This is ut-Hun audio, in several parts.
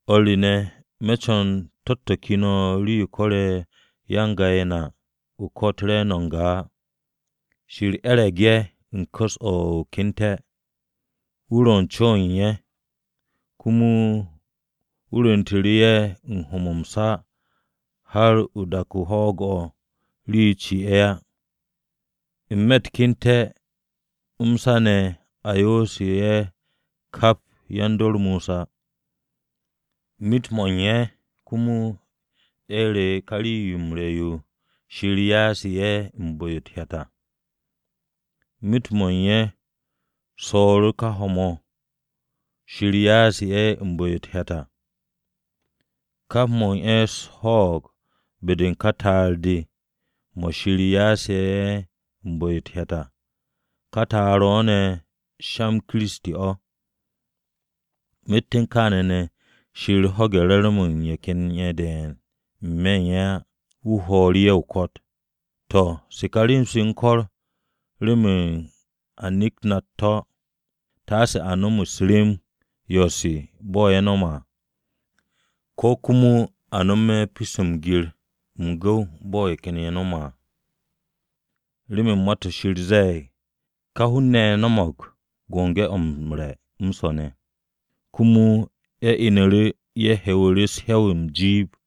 O̱r re ne̱, me̱ co̱n to̱-to̱ ke no̱ rii-yo ko̱re̱ ya-n-ga-ye̱ na o-ko̱t re̱e̱no̱ n-ga á. Shir e̱re̱g ye̱ u̱n ku̱s-o̱ o-ke'ente̱. Wu̱ ro̱ u̱n co-o̱ u̱n ye̱. Komo wu̱ rwu̱ntu̱te̱ ye̱ u̱n ho̱-mo̱ m-sa har u̱n dak-o hwo̱'o̱g-o̱ rii-yo ci ye̱ á. N-me̱ u̱t-ke'ente̱ m-sa ne̱ a yo'osu̱ ye̱ kap yan-dor Mosa. Myet-mo̱ u̱n ye̱ komo ye̱ re̱e̱ru̱ ká rii-yo m-re̱ yo Shir ya'ase̱ ye̱ u̱n bu̱-yo u̱t-hyat à. Myet-mo̱ u̱n ye̱ swo̱o̱ru̱ ká ho̱-mo̱ Shir ya'ase̱ ye̱ u̱n bu̱-yo u̱t-hyat à. Kap mo̱ u̱n ye̱ swo̱o̱g be-de u̱n ká ta'ar-o̱, mo̱ Shir ya'ase̱ ye̱ u̱n bu̱-yo u̱t-hyat à. Ká ta'ar-o̱ ne̱ sha-m Kiristi mo̱. Myet u̱n kaane̱ ne̱, Shir ho̱ge̱ re̱re̱m-mo̱ u̱n ye̱ ken ye̱ de̱e̱n n-me̱ u̱n ye̱ á, wu̱ homu̱ru̱ ye̱ o-ko̱t. To̱, se kà rem-se u̱n ko̱r remen a nekt na u̱t-to̱, taase a nom rem-u̱s yo̱-se bo̱ ye̱ no̱me̱ à, ko̱ komo a nome̱ pyo-se m-gir m-gu̱w bo̱ ye̱ ken ye̱ no̱me̱ à. Remen Ma-to̱ Shir ze̱e̱g, “Ka hun-ne̱ ye̱ no̱mo̱g biki-o̱ m-re̱ m-swo̱ ne̱, komo ye̱ inu̱ru̱ ye̱ he̱wu̱ru̱ u̱s-he̱w m-jiib.”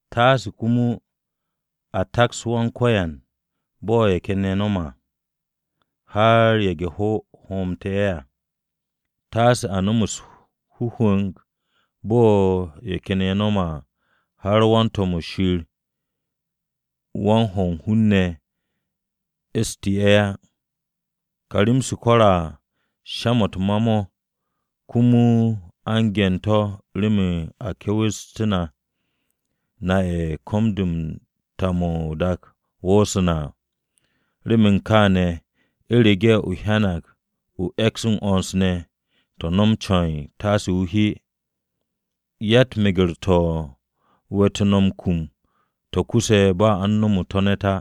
Taase komo a taks Kiristi bo̱ ye̱ ken ye̱ nome̱, har ye̱ge̱-hwo̱ hoomte̱ ye̱ à. Taase a nom u̱s-hwu̱mu̱g bo̱ ye̱ ken ye̱ nome̱, har wan-to̱m-wu̱ Shir wan-ho̱ u̱n hun-ne̱ e̱e̱stu̱ ye̱ à. Ká rem-se ko̱ru̱ ye̱ à sha-mo̱ u̱t-ma mo̱ komo a u̱n ge̱n-to̱ remen a ke̱we̱stú̱ na, na ye̱ ko̱m-de u̱n ta-mo̱ o-dak 'wo̱sse̱ à. Remen kaane̱ u̱rege̱ o hyanag o e̱ks m-'wo̱ns ne̱, to̱, no̱m ce̱e̱n taase o hye. Yatt meger-to̱ we̱tu̱ no̱ m-kum to̱ kuse̱ ba a u̱n nomo to̱ ne̱t á.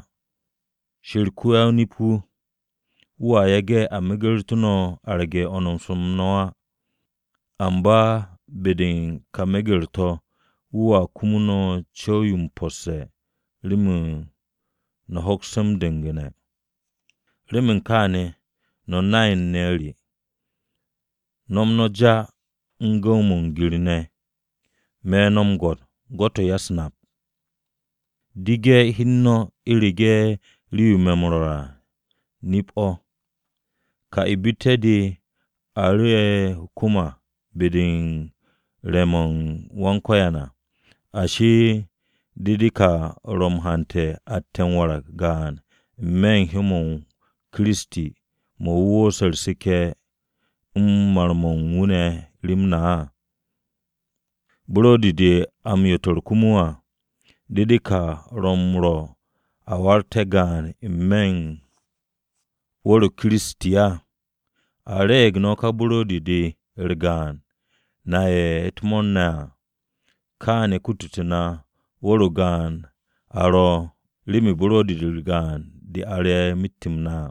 Shir ko-ya-o-nip-wu̱, wu̱a yage̱ a megertu̱ no̱ arge̱ 'wo̱ns-m no̱ á, amba be-de u̱n ká meger-to̱, wu̱a kutu no̱ co̱w-yo m-posse̱ remen no̱ hokste̱ m-du̱ngu̱ne̱. Remen kaane̱ no̱ nay-ne̱ re, no̱m no̱ já u̱n gu̱w-mo̱ m-gir ne̱. Me̱ no̱ m-gwo̱t, gwo̱t-o̱ u̱n ya-u̱s-nap. Dege̱ no̱ hi u̱n no̱ u̱rege̱ rii-yo me̱ m-rwo̱r à nip-o̱. Ká ibitte̱-de a ru̱'e̱ o-kwu̱m be-de u̱n re̱-mo̱ u̱n Wan-Ko̱yan à, ashi, ¿de de ka ro̱ m-hante̱ atte̱ m-warag gaan n-me̱ u̱n hyó-m Kiristi mo̱ a wu̱u̱se̱ u̱r-seke̱ u̱n mar-mo̱ u̱n wu̱ rem na à? Buro̱di-de a m-yotor komo à, ¿de de ka ro̱ na m-rwo̱ a waragte̱ gaan n-me̱ u̱n wu̱r-o̱ u̱n Kiristi á? A re̱e̱g no̱ ka buro̱di-de u̱r-gaan na ye̱ ro̱ u̱t-mo̱o̱r ne̱ à. Kaane̱ kutute̱ na wu̱r-o gaan a ro̱, remen buro̱di-u̱r gaan-de a re̱ myet-m na.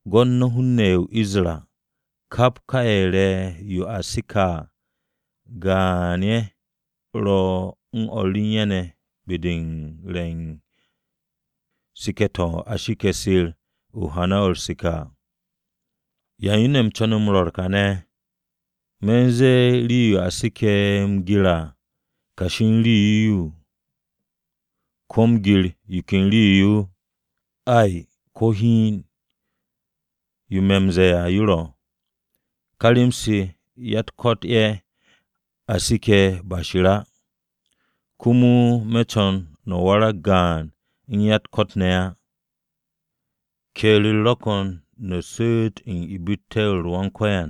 Gwo̱t no̱ hun-ne̱ ye̱ o-Isra. Kap ka ye̱ re̱ yo a seke̱ à, gaan-ye̱ ro̱ u̱n o̱r u̱n ye̱ ne̱ be-de u̱n re̱ u̱n seke̱ to̱ a seke̱ Shir u̱n hana-o̱ u̱r-seke̱ à. ¿Ya u̱n yo ne̱ u̱m co̱ne̱ m-rwo̱r kane̱? ¿Me̱ u̱n ze̱e̱ o̱ rii-yo a seke̱ m-gir à kashi u̱n rii-yo? ¿Ko̱ m-gir yo ken rii-yo? Ay, ko̱ hiin, yo me̱ m-ze̱e̱ à yo ro̱, ka rem-se ya-u̱t-ko̱t ye̱ a seke̱ ba Shir á. Komo, me̱ co̱n no̱ warag gaan u̱n ya-u̱t-ko̱t ne̱ á. Ke̱e̱r-u̱r ro̱ ko̱n no̱ su̱u̱t u̱n ibitte̱-u̱r Wan-Ko̱yan,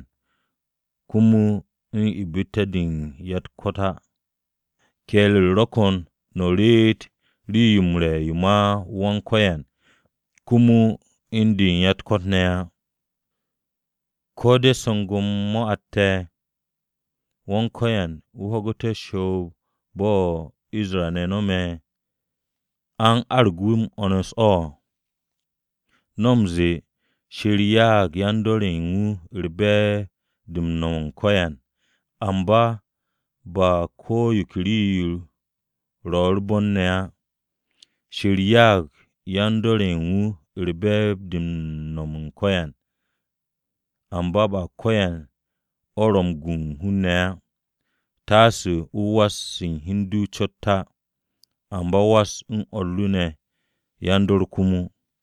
komo u̱n ibitte̱-de ya-u̱t-ko̱t ne̱ á. Ke̱e̱r-u̱r ro̱ ko̱n no̱ reet rii-yo m-re̱ yo ma Wan-Ko̱yan komo u̱n yo u̱n ya-u̱t-ko̱t ne̱ á. ¿Ko̱ de̱ su̱gu̱m-yo atte̱ Wan-Ko̱yan Wu̱ ho̱gu̱te̱ u̱r-shoob bo̱ Isra-ne̱ no̱me̱? ¿A u̱n arag wu̱ m-'wo̱ns o̱? No̱ m-ze̱e̱, “Shir ya'ag yan-dor ye̱ u̱n wu̱ be̱e̱b-de m-no̱m ko̱yan” amba ba ko̱ yo ke rii-yo ro̱ u̱r-bon ne̱ á. “Shir ya'ag yan-dor ye̱ u̱n wu̱ be̱e̱b-de m-no̱m ko̱yan” amba ba ko̱yan o̱ ro̱ m-gu hun-ne̱ á. Taase o was u̱n hi u̱n du ne̱ cot á, amba o was u̱n o̱r ru ne̱ yan-dor komo.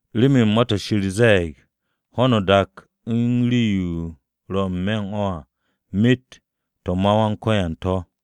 Remen Ma-to̱ Shir ze̱e̱g, “Ho̱no o-dak u̱n rii-yo ro̱ n-me̱ u̱n o̱ ne̱ à myet to̱ ma Wan-Ko̱yan to̱.”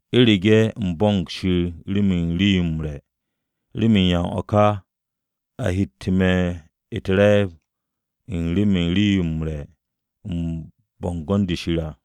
U̱rege̱ u̱m bo̱mo̱g Shir remen rii-yo m-re̱, ¿remen ya u̱n o̱ ka a hette̱ me̱ u̱t-re̱e̱b u̱n remen rii-yo u̱m re̱ u̱n bo̱ngo̱n-de Shir à?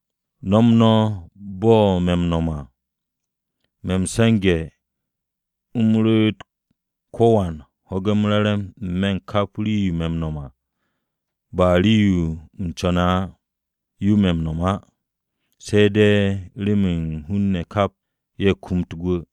No̱m no̱ bo̱ me̱ m-no̱m à. Me̱ m-se̱nge̱ u̱m ru̱'u̱t ko̱wan ho̱ge̱ m-re̱re̱m n-me̱ u̱n kap o̱ u̱n rii-yo me̱ m-no̱m à, ba rii-yo u̱m co̱ne̱ à yo me̱ m-no̱m á, se̱ de̱ remen hun-ne̱ kap ye̱ kumut gwu̱.